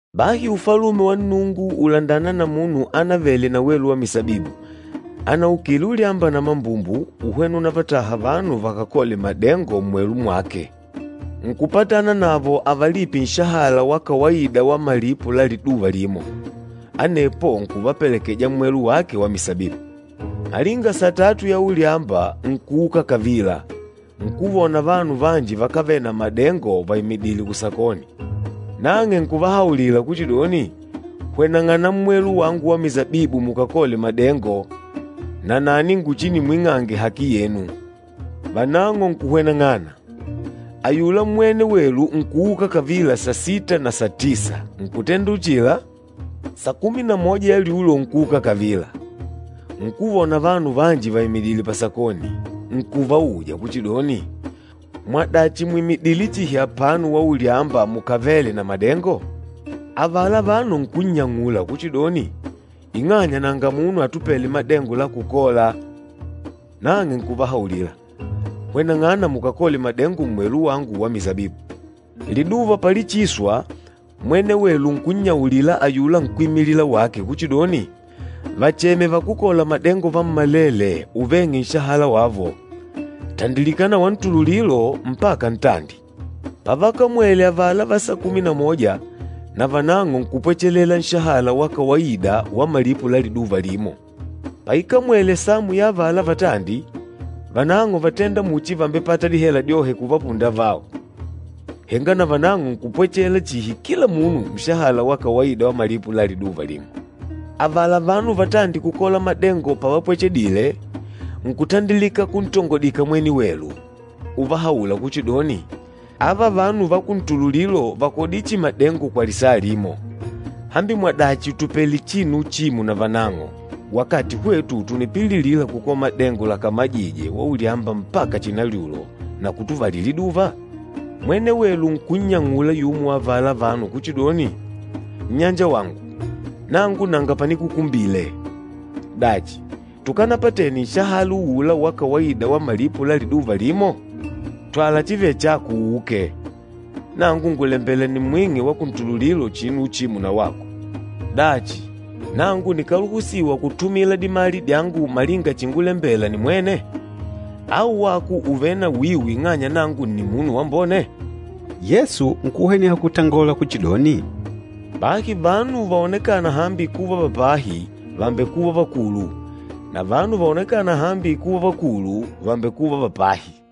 “Bahi Ufalume wa Nnungu ùlandana na munu ánavele na welu wa misabibu, anaukile ulyamba na mambumbu, uhwena unavataha vanu vakakole madengo mmwelu mwake. Nkupatana navo avalipe nshahala wa kawaida wa malipo la liduva limo, anepo nkuvapelekeja mmwelu wake wa misabibu. Malinga satatu ya ulyamba nkuuka kavila, nkuvona vanu vanji vakávele na madengo vaimidìlè kusakoni. Nang'e nkuvahaulila kuchidoni, ‘Hweneng'ana mmwelu wangu wa misabibu mukakole madengo, nanani nguchinimwing'ange haki yenu.’ Vanang'o nkuhweneng'ana. Ayula mwene welu nkuuka kavila sasita na satisa, nkutenda uchila. Sakumi na moja ya lyulo nkuuka kavila, nkuvona vanu vanji vaimidìlè pasakoni, nkuvauja kuchidoni, ‘Mwadachi mwìmidile chihi apano waulyamba mukavèlè na madengo?’ Avala vanu nkunnyang'ula kuchidoni, ‘Ing'anya nanga munu atupêle madengo la kukola.’ Nang'e nkuvahaulila, ‘Hweneng'ana mukakole madengo mmwelu wangu wa misabibu.’ Liduva palichiswa, mwene welu nkunnyaulila ayula nkwímilila wake kuchidoni, ‘Vacheme vakúkola madengo vammalele uveng'e nshahala wavo, tandilika na wantululilo mpaka ntandi.’ Pavakamwele avala va sakumi na moja, navanang'o nkupwechela nshahala wa kawaida wa malipo la liduva limo. Paikamwele samu ya avala vatandi, vanang'o vátenda muchi vàmbepata dihela dyohe kuvapunda avao, henga navanang'o nkupwechela chihi kila munu nshahala wa kawaida wa malipo la liduva limo. Avala vanu vatandi kukola madengo pavapwechedile, nkutandilika kuntongodika mwene welu, uvahaula kuchidoni, ‘Ava vanu va kuntululilo vàkodile chihi madengo kwa lisaa limo, hambi mwadachi ùtupele chihi uchimo navanang'o, wakati hwetu tùnipililila kukola madengo lakamajije waulyamba mpaka chinalyulo, na kutuvalila liduva?’ Mwene welu nkunnyang'ula yumo wa avala vanu kuchidoni, ‘Nnyanjawangu, nangu nanga panikukumbile. Dachi, tukanapatene nshahala uula wa kawaida wa malipo la liduva limo? Twala chivêle chako uuke. Nangu ngùlembela nimwing'e wa kuntululilo chinu uchimo na wako. Dachi, nangu nikáluhusiwa kutumila dimali dyangu malinga chíngulembèlà nimwene? Au wako ùvele na wiu ing'anya nangu nni munu wambone?’” Yesu nkuhweneha kutangola kuchidoni, “Bahi vanu vaonekâna hambi kuva va pahi, vàmbekuva vakulu, na vanu vaonekâna hambi kuva vakulu, vàmbekuva va pahi.”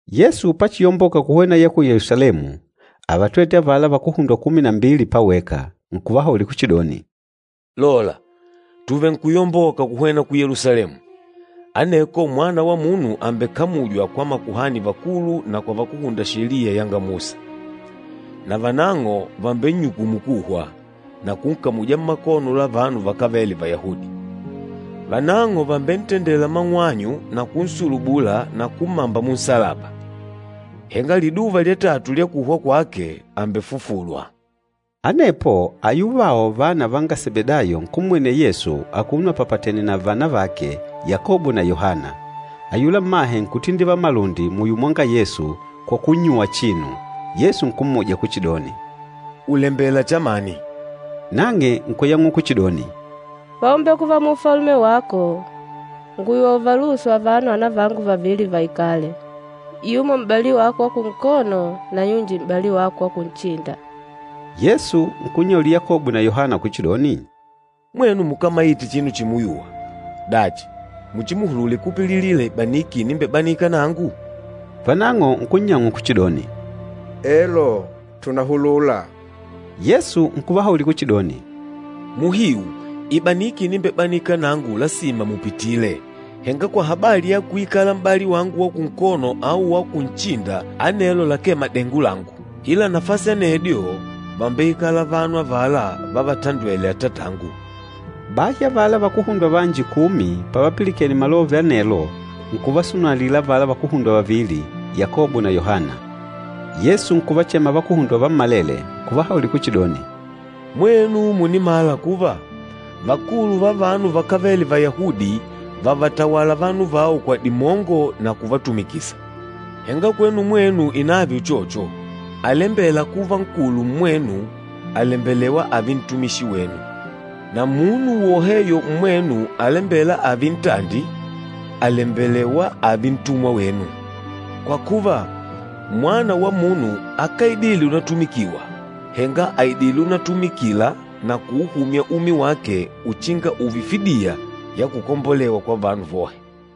Yesu pachiyomboka kuhwena ya ku Yelusalemu, ávatwete avala vakuhundwa kumi na mbili paweka, nkuvahaulila kuchidoni, “Lola, tùvenkuyomboka kuhwena ku Yelusalemu, aneko Mwana wa Munu àmbekamujwa kwa makuhani vakulu na kwa vakúhunda Sheliya yanga Musa. Na vanang'o vàmbennyukumu kuhwa, na kunkamuja mmakono la vanu vakávele Vayahudi. Vanang'o vàmbentendela mang'wanyu na kunsulubula na kummamba munsalaba. Henga liduva lya tatu lya kuhwa kwake, àmbefufulwa.” Anepo ayuvao vana vanga Sebedayo nkummwenela Yesu akuno apapatene na vana vake Yakobo na Yohana. Ayula mmahe nkutindivala malundi muyo mwanga Yesu kwa kunnyuwa chinu. Yesu nkummuja kuchidoni, “Ùlembela chamani?” Nang'e nkuyang'ula kuchidoni, “Paumbekuva mu Ufalume wako, ngùyuwa uvaluhusu avano anavangu vavili vaikale, yumo m'bali wako wa kunkono na yunji m'bali wako wa kunchinda.” Yesu nkunnyaulila Yakobo na Yohana kuchidoni, “Mwenu mukámaite chinu chimuyuwa. Dachi, muchimuhulule kupililila ibaniki inimbebanika nangu?” Vanang'o nkunnyang'ula kuchidoni, “Elo, tùnahulula.” Yesu nkuvahaulila kuchidoni, “Muhiu, ibaniki inimbebanika nangu lasima mupitile, henga kwa habali ya kuikala m'bali wangu wa kunkono au wa kunchinda anelo lakee madengo langu. Ila nafasi anedyo vàmbeikala vanu avala vávatandwèlè Atatangu.” Bahi avala vakuhundwa vanji kumi pavapilikene malove anelo nkuvasunalila avala vakuhundwa vavili, Yakobo na Yohana. Yesu nkuvachema vakuhundwa vammalele, nkuvahaulila kuchidoni, “Mwenu mùnimala kuva, vakulu va vanu vakávele Vayahudi vàvatawala vanu vao kwa dimongo na kuvatumikisa. Henga kwenu mwenu inààve uchocho. Alembêla kuva nkulu mmwenu, àlembelewa ààve ntumishi wenu. Na munu woheyo mmwenu alembêla ààve ntandi, àlembelewa ààve ntumwa wenu. Kwa kuva, Mwana wa Munu akáidile unatumikiwa, henga àidile unatumikila na kuuhumya umi wake uchinga ùùve fidiya ya kukombolewa kwa vanu vohe.”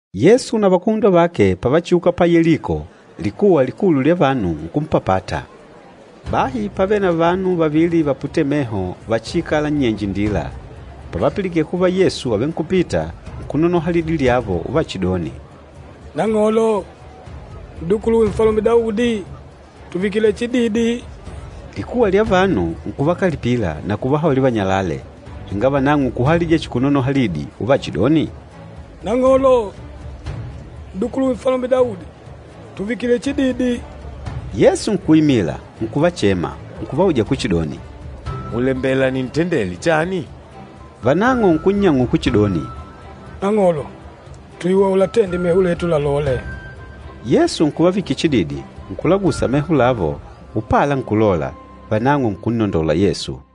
Yesu na vakuhundwa vake pavachiuka pa Yeliko, likuwa likulu lya vanu nkumpapata. Bahi pávele na vanu vavili vaputêle meho vachiikâla nnyenje indila. Pavapilikene kuva Yesu àvenkupita, nkunonoha lidi lyavo uvachidoni, “Nang'olo, N'dukuluwe Nfalume Daudi, tùvikile chididi!” Likuwa lya vanu nkuvakalipila na kuvahaulila vanyalale, henga vanang'o nkuhalija chihi kunonoha lidi uvachidoni, “Nang'olo, N'dukuluwe Nfalume Daudi, tùvikile chididi!” Yesu nkuimila, nkuvachema, nkuvauja kuchidoni, “Mùlembela nintendele chani?” Vanang'o nkunnyang'ula kuchidoni, “Nang'olo, tùyuwa ulatende meho letu lalole.” Yesu nkuvavikila chididi, nkulagusa meho lavo, upala nkulola, vanang'o nkunnondola Yesu.